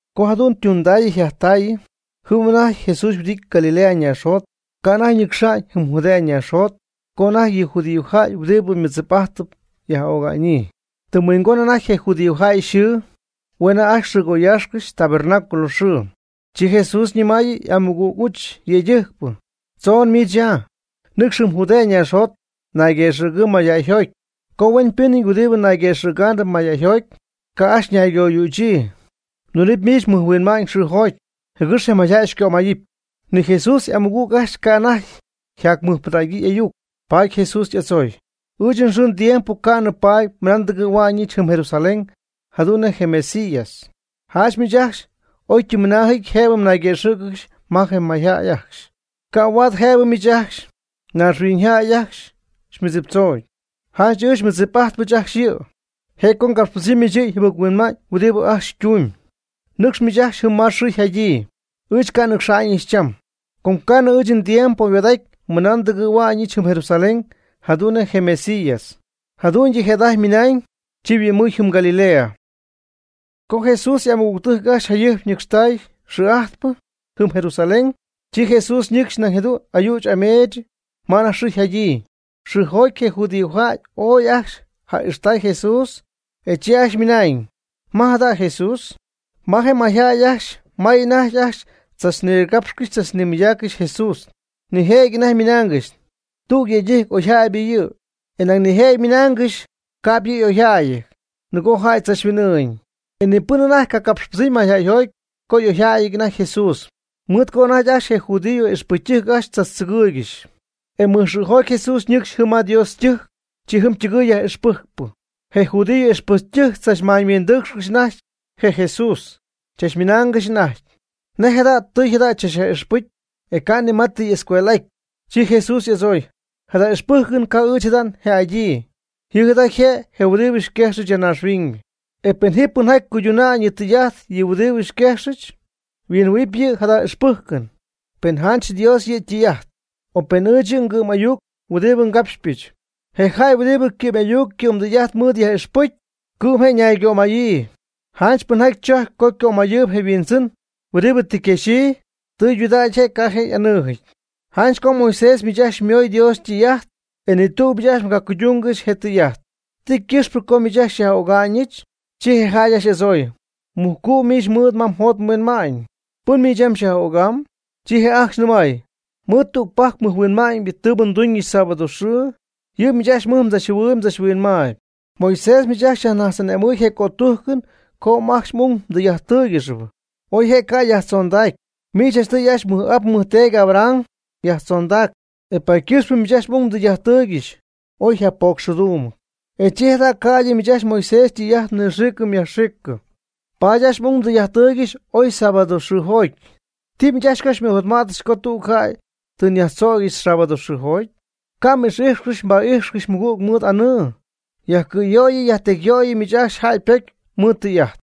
Co jadu'n ytundaayɨ yjajtaayɨ, jɨm anajty Jesús yhuɨdity Galilea naaxjot, ca' anajty ñɨcxa'ñ jɨm Judea naaxjot, co anajty yɨ judíojäy ajcxy huɨdibɨ mɨdzip'ajtɨp yaj'öga'ñyii. Tɨm huingon anajty je judíojäy yxɨɨ, hue' anajty ajcxy yxɨɨgoyäxy Tabernáculo xɨɨ. Chi Jesús ñɨmaayɨ y'amɨgüg y'uch yëydɨjcpɨ: ―Tzon miich ya, nɨcx jɨm Judea naaxjot nayguëxɨ̈gɨɨ mayjäyjoty. Com huenpɨnɨty huɨdibɨ nayguëxɨ̈gaanɨp mayjäyjoty, ca' ajcxy naygoyüchyii. Mdunɨpy miich mɨjhuinma'ñ xɨɨjoty, jɨgɨx je mayjäy xycömayɨpy. Ni Jesús y'amɨgüg ajcxy ca' anajty yjaty ymɨjpɨdägyii y'ayuc. Paady Jesús y'adzooy: ―Ɨɨch nxɨɨ ndiempo ca'nɨ paty mɨna ndɨgɨ̈hua'ñɨch jɨm Jerusalén jadu'n nej je Mesías. Janch miich ajcxy oytɨmymɨnaajɨty jëbɨ mnayguëxɨ̈cɨgɨxy ma je mayjäy ajcxy. Ca' huaad jëbɨ miich ajcxy, naaxhuiñyjäy ajcxy, xymɨdziptzoñ. Janch ɨɨch xymɨdzip'ajtpɨch ajcxy yɨ', je' co ngapxpɨdzɨmyɨch yɨ yjɨbɨc-huinma'ñ huɨdibɨ ajcxy ytumyb. Nɨcx miich ajcxy jɨm ma xɨɨ yjadyii. Ɨɨch ca' nnɨcxa'ñɨch cham, com ca'nɨ ɨɨch ndiempo yhuaad'aty mɨna ndɨgɨ̈huɨbyɨch jɨm Jerusalén jadu'n nej je Mesías. Jadu'ñydɨ jëda'ajty ymɨnañ, chi yhuɨ'mɨɨy jɨm Galilea. Co Jesús y'amɨgügtɨjc ajcxy jayɨjp ñɨcxtay xɨɨ'ajtpɨ jɨm Jerusalén, chi Jesús nɨcxy nañ jadu'n ayüch ameech ma anajty xɨɨ yjadyii. Xɨɨjoty je judíojäy ooy ajcxy ja'ixtay Jesús, e chi ajcxy ymɨnañ: ―¿Ma jada' je Jesús? Ma je mayjäy ajcxy may anajty ajcxy tzachnigapxcɨxy tzachnimɨydaaccɨxy Jesús. Nijëjɨty anajty ymɨnaangɨxy: “Tüg yëydɨjc oyjäybɨ yɨ'”; e nañ nijëjɨty ymɨnaangɨxy: “Ca'p yɨ' y'oyjäyɨty, nɨgo jäy tzachhuin'ɨɨñ.” E ni pɨn anajty ca' capxpɨdzɨmy mayjäyjoty co y'oyjäyɨty anajty Jesús, mɨɨd co anajty ajcxy je judío ixpɨcytɨjc ajcxy tzachtzɨgɨɨygɨxy. E mɨjxɨɨjoty Jesús ñɨcxy jɨm ma Dios ytɨjc, chi jɨm ytɨgɨɨy yaj'ixpɨjcpɨ. Je judío y'ixpɨcytɨjc tzachmaañyhuindɨɨcxcɨxy anajty je Jesús, chachmɨnaangɨxy anajty: ―¿Nej jada' tijy jada chach'ixpɨcyɨty? e ca' ni ma tɨ y'escuel'aty. Chi Jesús y'adzooy: ―Jada ixpɨjcɨn ca' ɨɨch jada një'adyii. Yɨ' jada yje' je huɨdibɨ xyquejxɨch ya naaxhuiñ. E pen ji pɨnjaty cuydunaanɨ yɨ' ytɨy'ajt je huɨdibɨ xyquejxɨch, huinjɨhuɨ̈huɨpy yɨ' jada ixpɨjcɨn, pen janch Dios yɨ' ytɨy'ajt, o pen ɨɨch yɨ' ngɨ'm ayuc huɨdibɨ ngapxypɨch. Je jäy huɨdibɨ ycɨ'm'ayuc ycɨ'mdɨy'ajt mɨɨd yaj'ixpɨcy, cɨ'm je' ñaygömaya'ñyii. Janch pɨnjaty tzojcp co ycömayɨɨyb je' yhuindzɨn huɨdibɨ tɨ yquexyii, tɨydudägy je', ca' je' y'anɨɨjɨty. Janch co Moisés miich ajcxy xymoy Dios ytɨy'ajt. E ni tüg miich ajcxy mgacuydungɨxy je tɨy'ajt. ¿Ti ycɨxpɨ co miich ajcxy xyaj'öga'nɨch? Chi je jäy ajcxy y'adzooy: ―Mujcu' miich mɨɨd ma mjot mhuinma'ñ. ¿Pɨn miich yam xyaj'ögam? Chi je' ajcxy nɨmay: ―Mɨɨd tügpajc mɨjhuinma'ñ tɨɨbɨ nduñɨch sábado xɨɨ, yɨ' miich ajcxy mɨj mdzachjɨhuɨɨyb mdzachhuinmaayb. Moisés miich ajcxy xyajnajtz'ane'mɨɨy je cötujcɨn co ajcxy m'ung mdɨy'ajttɨ́ɨyɨgɨxy (oy je' ca' yajtzondac, miich janchtɨy ajcxy mmɨj'ap mmɨjteedy Abraham yajtzondac), e paady ycɨxpɨ miich ajcxy m'ung mdɨy'ajttɨɨygɨxy oy yjapocxxɨɨdumɨty. E chi jada' ca'ydɨ miich ajcxy Moisés ytɨy'ajt mnɨxiicɨ myajxiicɨ, paady ajcxy m'ung mdɨy'ajttɨɨygɨxy oy sábado xɨɨjoty. ¿Ti miich ajcxy co xymɨjotma'tcɨxɨch co tüg jäy tɨ nyajtzögyɨch sábado xɨɨjoty? Ca' m'ix'ijxcɨxy mba'ijxcɨxy mmɨgüg mɨɨd anɨɨ. Yajcɨ̈yöyɨ yajtecyyöyɨ miich ajcxy jäy ypocy mɨɨd tɨy'ajt.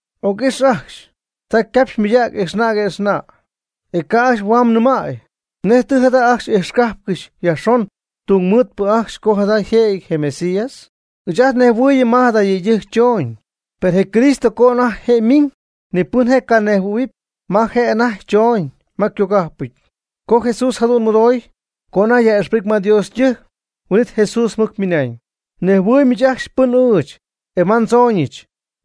Oc'ix ajcxy, ta ycapxy ymɨydägy ijxna' que'xna', e ca' ajcxy huam nɨmäy. ¿Nej tɨ jada ajcxy ijxcajpcɨxy yajxon tungmɨɨdpɨ ajcxy co jada yjëjɨty je Mesías? Ɨɨch ajt nnejhuɨɨyɨm ma jada yëydɨjc chooñ. Per je Cristo co anajty je' ymiñ, ni pɨn je' canejhuɨ̈huɨpy ma je' anajty choñ ma ycogajpɨty. Co Jesús jadu'n mɨdooy, co anajty yaj'ixpɨcy ma Dios ytɨjc, huin'it Jesús mɨc ymɨnañ: ―Mnejhuɨɨyb miich ajcxy pɨn ɨɨch, e ma ndzooñɨch.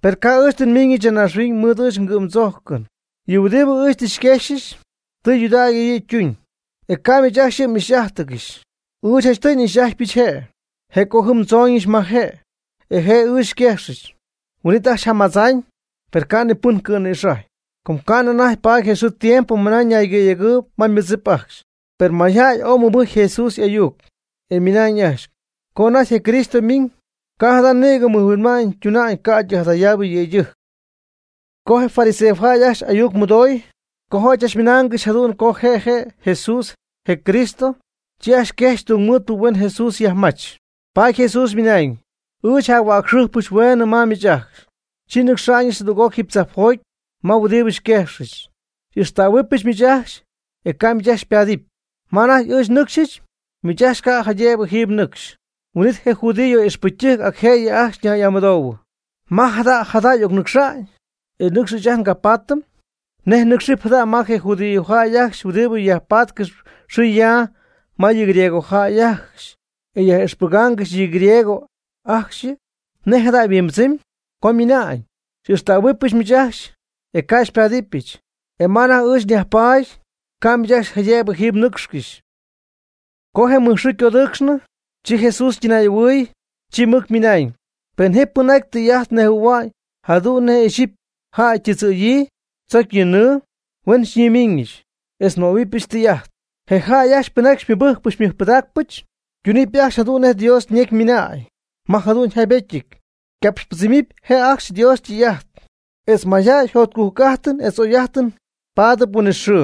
Per ca'p ɨɨch tɨ nmiñɨch ya naaxhuiñ mɨɨd ɨɨch ngɨ'mdzojcɨn. Yɨ huɨdibɨ ɨɨch tɨ xyquexyɨch, tɨydudägy yɨ' ytuñ, e ca' miich ajcxy yɨ' m'ixy'ájtɨgɨxy. Ɨɨch janchtɨy n'ixy'ajtypɨch je'. Je' co jɨm ndzooñɨch ma je', e je' ɨɨch xyquejxɨch. Huin'it ajcxy jamadzaañ, per ca' ni pɨn cɨ̈nïxajɨy, com ca'nɨ anajty paady je xɨɨ je tiempo mɨna ñaygɨ̈yegɨɨyb ma ymɨdzip ajcxy. Per mayjäy ooy mɨbɨjcy je Jesús y'ayuc, e ymɨnañ ajcxy: ―Co anajty je Cristo ymiñ, ca' jada' nïgɨ mɨjhuinma'ñ tuna'ñ ca'ydɨ jadayaabɨ yëydɨjc. Co je fariseojäy ajcxy ayuc mɨdooy co jäy chachmɨnaangɨxy jadu'n co je Jesús je' je' je Cristo, chi ajcxy quejxy tungmɨɨdpɨ huen Jesús yajmach. Paady Jesús ymɨnañ: ―Ɨɨch jac-huäcxɨjpɨch hueenɨ ma miich ajcxy, chi nnɨcxa'ñɨch jadüg'oc jiiby tzajpjoty ma huɨdibɨ xyquejxɨch. Xy'ixtähuɨbɨch miich ajcxy, e ca' ɨɨch miich ajcxy xypaadɨpy. Ma anajty ɨɨch nnɨcxyɨch, miich ajcxy ca' jaydëbɨ jiiby mnɨcxcɨxy. Huin'it je judíojäy ixpɨcytɨjc acjëyɨ ajcxy ñay'amɨdoohuɨ: ―¿Ma jada jada' y'ocnɨcxa'ñ, e nɨcxy ɨɨch ajt ngapaatɨm? ¿Nej nɨcxɨɨb jada' ma je judíojäy ajcxy huɨdibɨ yajpaatcɨxy yxɨɨ yaa ma yɨ griegojäy ajcxy, e yaj'ixpɨgaangɨxy yɨ griegos ajcxyɨ? ¿Nej jada' yajhuimbɨdzɨmy? co ymɨna'ñ: “Xy'ixtähuɨbɨch miich ajcxy, e ca' xypáadɨbɨch, e ma anajty ɨɨch nyajpaady, ca' miich ajcxy jaydëbɨ jiiby mnɨcxcɨxy.” Co je mɨjxɨɨ ycodɨɨcxnɨ, chi Jesús ytɨnay'ahuɨy, chi mɨc ymɨnañ: ―Pen ji pɨnjaty tɨy'ajt nejhuɨ̈hua'ñ jadu'n nej ixyipy jäy ytɨdzɨ̈yii tzocy yɨ nɨɨ, huen xyñimiiñɨch, etz nmöhuɨbɨch tɨy'ajt. Je jäy ajcxy pɨnjaty xymɨbɨjcpɨch xymɨjpɨdaacpɨch, ytunɨpy ajcxy jadu'n nej Dios ñecy ymɨna'ñ ma jadu'n yjaybetyɨty: “Ycapxypɨdzɨmɨpy je' ajcxy Dios ytɨy'ajt, etz mayjäy jotcujc'ajtɨn etz jugy'ajtɨn pada'ñ huinɨxɨɨ,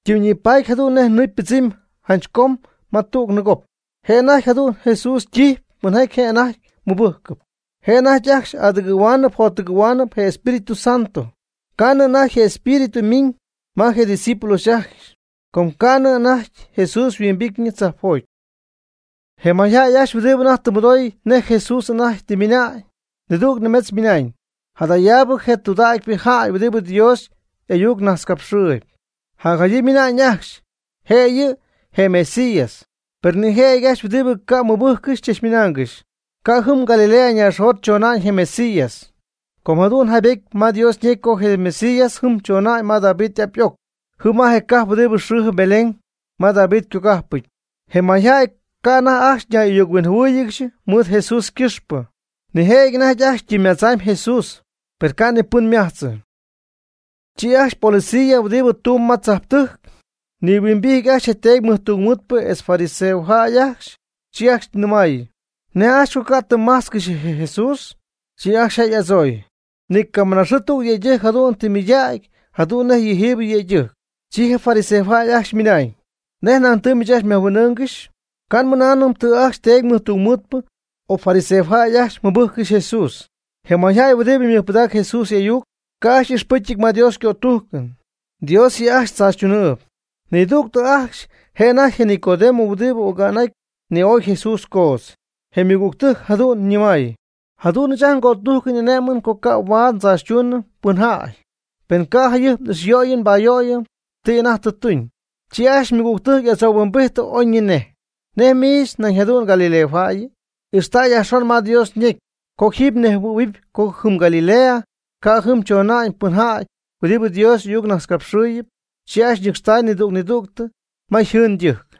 ytimyñipaatyp jadu'n nej nɨɨ ypɨdzɨmy janch com ma tüg nɨɨgop.” Je' anajty jadu'n Jesús ytijyp pɨnjaty je' anajty mɨbɨjcɨp, je' anajty ajcxy adɨgɨ̈huaanɨp jottɨgɨ̈huaanɨp je Espíritu Santo. Ca' nɨ anajty je Espíritu yminɨ ma je discípulos ajcxy com ca'nɨ anajty Jesús yhuimbityñɨ tzajpjoty. Je mayjäy ajcxy huɨdibɨ anajty tɨ mɨdooy nej Jesús anajty tɨ ymɨna'ñ, nidüg nimetz ymɨnañ: ―Jadaabɨ je' je tɨydudägypɨ jäy huɨdibɨ Dios y'ayuc najtzcapxɨɨyɨp. Jacjadyii ymɨnañ ajcxy: ―Je' yɨ' je Mesías. Per nijëjɨty ajcxy huɨdibɨ ca' ymɨbɨjccɨxy chachmɨnaangɨxy: ―Ca' jɨm Galilea naaxjot chona'ñ je Mesías. Com jadu'n yjaybetyɨty ma Dios ñecy co je Mesías jɨm chona'ñ ma David y'ap y'oc, jɨm ma je cajp huɨdi xɨɨjɨp Belén ma David ycogajpɨty. Je mayjäy ca' anajty ajcxy ñay'ayuc-huinjɨhuɨɨygɨxy mɨɨd Jesús ycɨxpɨ. Nijëjɨty anajty ajcxy ytɨmymadzamy Jesús, per ca' ni pɨn ymajtzɨ. Chi ajcxy policías huɨdibɨ tumb ma tzajptɨjc nihuimbijty ajcxy je teedy mɨjtungmɨɨdpɨ etz je fariseojäy ajcxy, chi ajcxy ñɨmaayɨ: ―¿Nej ajcxy co ca' tɨ mmajtzcɨxy je Jesús? Chi ajcxy je' y'adzooy: ―Nicamɨnaaxɨɨ tüg yëydɨjc jadu'n tɨ ymɨydägy jadu'n nej yɨjiibɨ yëydɨjc. Chi je fariseojäy ajcxy ymɨnañ: ―¿Nej nañ tɨ miich ajcxy myajhuin'ɨ́ɨnɨgɨxyɨ? Ca' nmɨnaanɨm tɨ ajcxy teedy mɨjtungmɨɨdpɨ o fariseojäy ajcxy mɨbɨjccɨxy Jesús. Je mayjäy huɨdibɨ mɨjpɨdaacɨ Jesús y'ayuc, ca' ajcxy y'ixpɨcyɨty ma Dios ycötujcɨn. Dios yɨ' ajcxy tzaachytunɨɨb. Nidügtɨ ajcxy je' anajty je Nicodemo huɨdibɨ oga'n'aty ni'oy Jesús coodz, je' ymɨgügtɨjc jadu'n nɨmay: ―Jadu'n ɨɨch ajt ngötujcɨn xy'ane'mɨm co ca' huaad ndzaachytuunɨm pɨnjäy, pen ca'p jayɨjp n'ixyöyɨm nbayöyɨm ti anajty tɨ tuñ. Chi ajcxy ymɨgügtɨjc y'adzohuimbijty oyñinej: ―¿Nej miich nañ jadu'n galileojäyɨ? Ixta' yajxon ma Dios ñecy, com jiiby mnejhuɨ̈huɨpy co jɨm Galilea ca' jɨm chona'ñ pɨnjäy huɨdibɨ Dios y'ayucnajtzcapxɨɨyɨp. Chi ajcxy ñɨcxtay nidüg nidüg ma yjɨɨn ydɨjc.